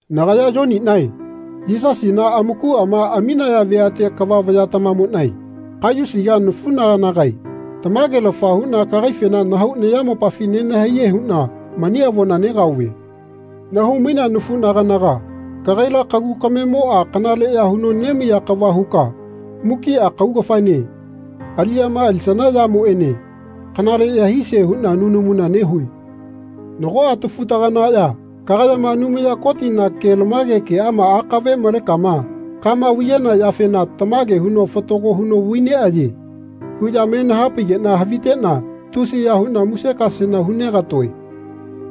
Nagaya Yoninae Yisasina amakuama aminaya veate kava vayatamamonae Kaiyusiga nafunaganagae tamagelafa huna kagaifena nahau nayamopafi nenahaiye huna mani avona negaove. Nahau-mainea nafunaganaga kagaila kagu kamemoa kanaleya huno nemaiya kava huka mukia kaugafaene aliyama alisana yamoene kanaleya hisie huna nunamuna nehue. Nagoa tafutaganaya kagayama Anumaya Kotina kelamage keama akave malekama kama vaiyana yafena Tamage huno fatago huno vai neaye. huya me nahapaigena havitena tusiya huna musekasena hu negatoe.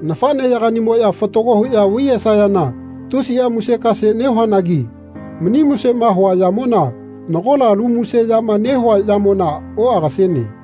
Nafaneyaganimoya fatago huya vai yesayana tusia musekase nehuanagi mani musema hua yamona nagola alu muse yama nehua yamona oagasene.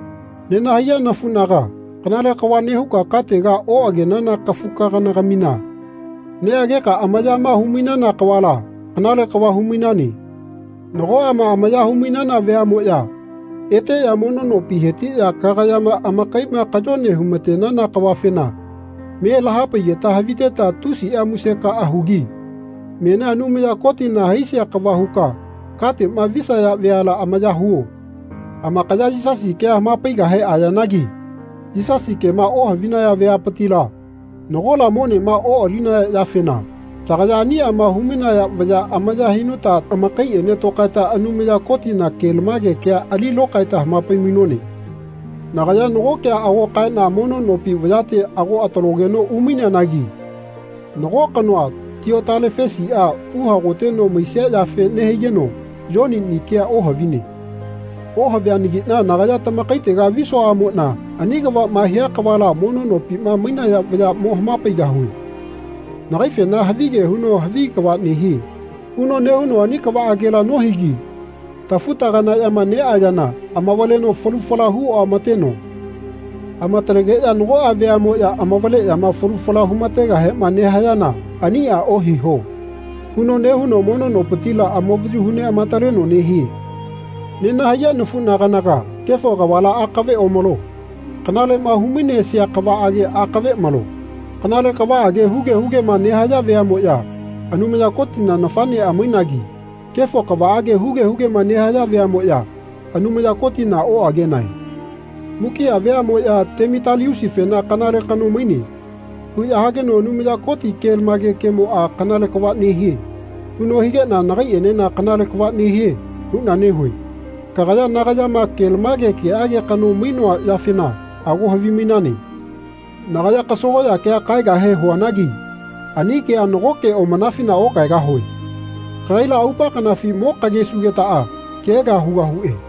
Nenahaiya nafunaga kanale kava nehuka katega oagenana kafukagana-gamina neageka amayama hu-mainana kavala kanale kava hu-mainane. Nagoama amaya hu-mainana veamoya eteya mono nopi hetiya kagayama amakaima kayone humatenana kavafena me lahapaigeta haviteta tusia musekaa hugi menia Anumaya Kotina haisia kava huka katema visaya veala amaya huo. Amakaya Yisasi kea hamapaigahe ayanagi Yisasi kema ohavinaya vayapitila nagola monema oalinaya yafena tagaya aniama hu-mainaya vaya amaya hinuta amakaiene tokaeta Anumaya Kotina kelamage kea ali lokaeta hamapai-mainone. Nagaya nago kea ago kaena mono nopi vayate ago atalogeno umaineanagi nago kanoa Tiotalefesia uhagoteno maisia yafe nehaigeno Yonini kea ohavine. Ohavianagina nagaya tamakaitega visuaamona ani kavama hia kavala mono nopima mainaya vaya mo hamapaigahue. Nagaifena havige huno Havi kava nehie. huno nehuno ani kavaagela nohigi tafuta-ganayama neayana amavaleno falu fala hu oamateno amatalegeya nagoa veamoya amavaleyama falu fala humategahema nehayana Ania ohiho. huno nehuno mono nopitila amavayu hu neamataleno nehie. Nenahaiya nafuna-ganaga kefo kavala akave omalo. Kanalema humainesia kavaage akave malo. Kanale kavaage huge hugema nehaya veamoya Anumaya Kotina nafanea mainagi kefo kavaage huge hugema nehaya veamoya Anumaya Kotina oagenae. Mukia veamoya Temitaliusifena Kanale kano maine. huya hageno Anumaya Koti kelamage kemoa Kanale kava nehie. huno higena nagaienena Kanale kava nehie. huna nehue. Kagaya nagayama kelamage keage kanoma mainoa yafena ago havimainane. Nagaya kasagoya kea kaegahe huanagi ani kea nagoke omanafina okaegahue. Kagaila aupa kanafi mo kagesugetaa kea kea hugahue.